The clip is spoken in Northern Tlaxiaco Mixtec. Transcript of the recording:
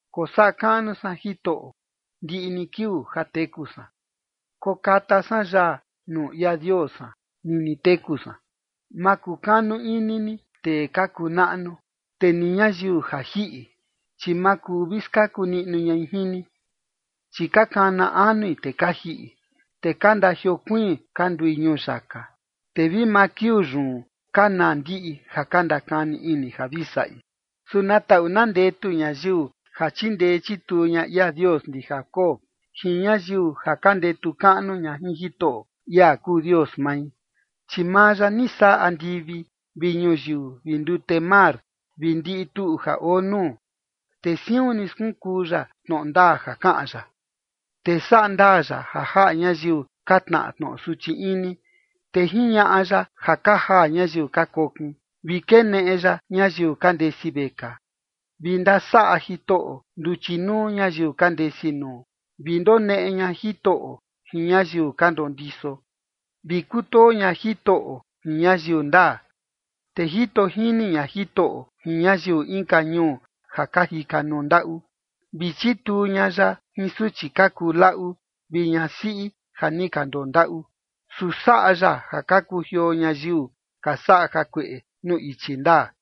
Kosaꞌa kaꞌnu san Jitoꞌo ndiꞌi ni kiuu ja teku san. Kokata san yaa nuu ia Dios san nini teku san. Ma kukanu ini ni tee ka kuu naꞌnu, te ni ñayiu ja jiꞌi, chi ma kuu vi skaku niꞌnu ñai jin ni. Chi ka kana anui te ka jiꞌi, te ka ndajiokuiin ka ndui ñuyaka. Te vi maa kiuu yun ka naa ndiꞌi ja ka ndakani ini ja vi saꞌi. Su na taꞌu na ndetu ñayiu ja chindee chituu ña ia Dios ndi Jacob, jin ñayiu ja ka ndetu kaꞌnu ña jin Jitoꞌo, ia kuu Dios mai. Chi maa ya ni saꞌa andivi vi ñuyiu vi ndute mar vi ndiꞌi tuꞌu ja oo nuu, te siun ni skunkuu ya tnoꞌo ndaa ja kaꞌan ya. Te saꞌa ndaa ya ja jaꞌa ñayiu ka tnaꞌa tnoꞌo suchi ini, te jiñaꞌa ya ja ka jaa ñayiu ka kokin, vi keneꞌe ya ñayiu ka ndesi vekaa. Vi ndasaꞌa Jitoꞌo nduchi nuu ñayiu ka ndesi nuu, vi ndoneꞌe ña Jitoꞌo jin ñayiu ka ndondiso, vi kutoo ña Jitoꞌo jin ñayiu ndaa. Te jito jini ña Jitoꞌo jin ñayiu inka ñuu ja ka jika nuu ndaꞌu, vi chituu ña ya jin suchi ka kuu laꞌu vi ñasiꞌi ja ni ka ndondaꞌu. Su saꞌa ya ja ka kujioo ñayiu ka saꞌa jakueꞌe nuu ichi ndaa.